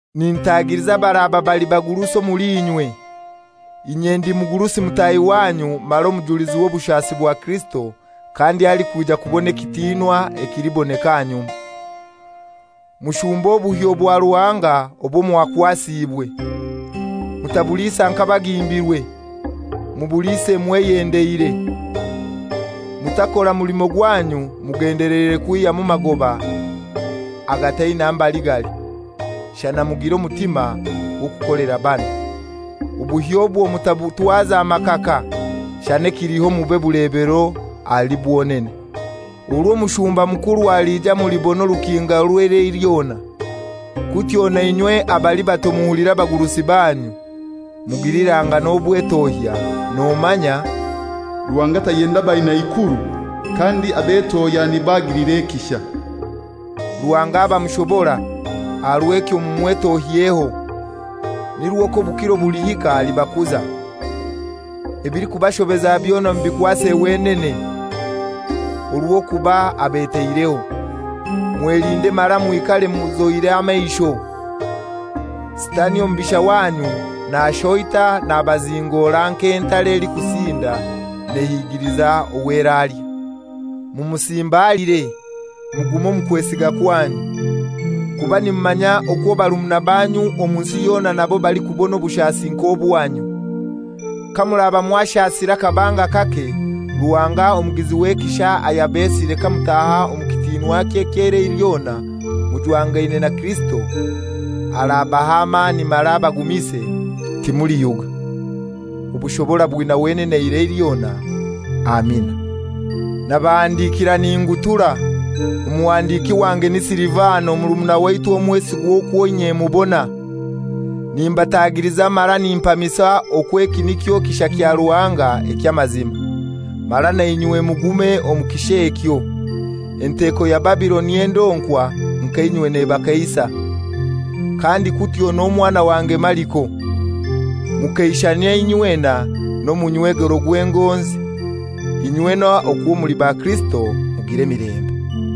Nintagiliza abaraba bali bagurusi omuli inywe, inye ndi mugurusi mutahi wanyu mara omujulizi w'obushasi bwa Kirisito kandi alikwija kubona ekitinwa ekiliboneka ahanyuma. Mushumbe obuhyo bwa Ruhanga obwo mwakwasiibwe. Mutabuliisa nk'abagimbirwe, mubuliise mweyendeire. Mutakora mulimo gwanyu mugendeleire kwihyamu magoba agataina mbali gali, shana mugire omutima gw'okukolera banu. Obuhyo obwo mutabutwaza makaka, shana ekiliho mube bulebero ahali bwonene. Orw'omushumba mukuru aliija mulibona orukinga orw'eirai lyona. Kutyo nainywe abali bato muhulire abagurusi banyu. Mugilirangane obwetohya, nomanya, «Ruhanga tayenda baina ikuru, kandi abetohya nibo agilira ekisha.» Ruhanga aba mushobora, aha rw'ekyo mumwetohyeho, nirwo k'obukiro bulihika alibakuza. Ebilikubashobeza byona mubikwase wenene, orw'okuba abetaireho. Mwelinde mara mwikare muzoire amaisho. Sitani omubisha wanyu nashoita nabazingora nk'entare elikusinda nehigiliza ow'eralya. Mumusimbaliire, mugume omu kwesiga kwanyu, kuba nimumanya okwo barumuna banyu omu nsi yona nabo balikubona obushasi nk'obwanyu. Kamuraba mwashasire akabanga kake, Ruhanga omugizi w'ekisha ayabesire kamutaha omu kitinwakye eky'eirai lyona mujwangaine na Kirisito, arabaha amani mara abagumise, timuliyuga. Obushobora bwina wenene eirai lyona. Amina. Nabahandikiira ningutura, omuhandiki wange ni Silivano, murumuna waitu omwesigwa okwo inye mubona. Nimbatagiliza mara nimpamisa okwo eki nikyo kisha kya Ruhanga eky'amazima, mara nainywe mugume omu kisha ekyo. Enteko ya Babiloni endonkwa nka inywe nebakeisa; kandi kutyo n'omwana wange Mariko. Mukeishanyie inywena nomunywegero gw'engonzi. Inywena okwo muli ba Kirisito mugire emilembe.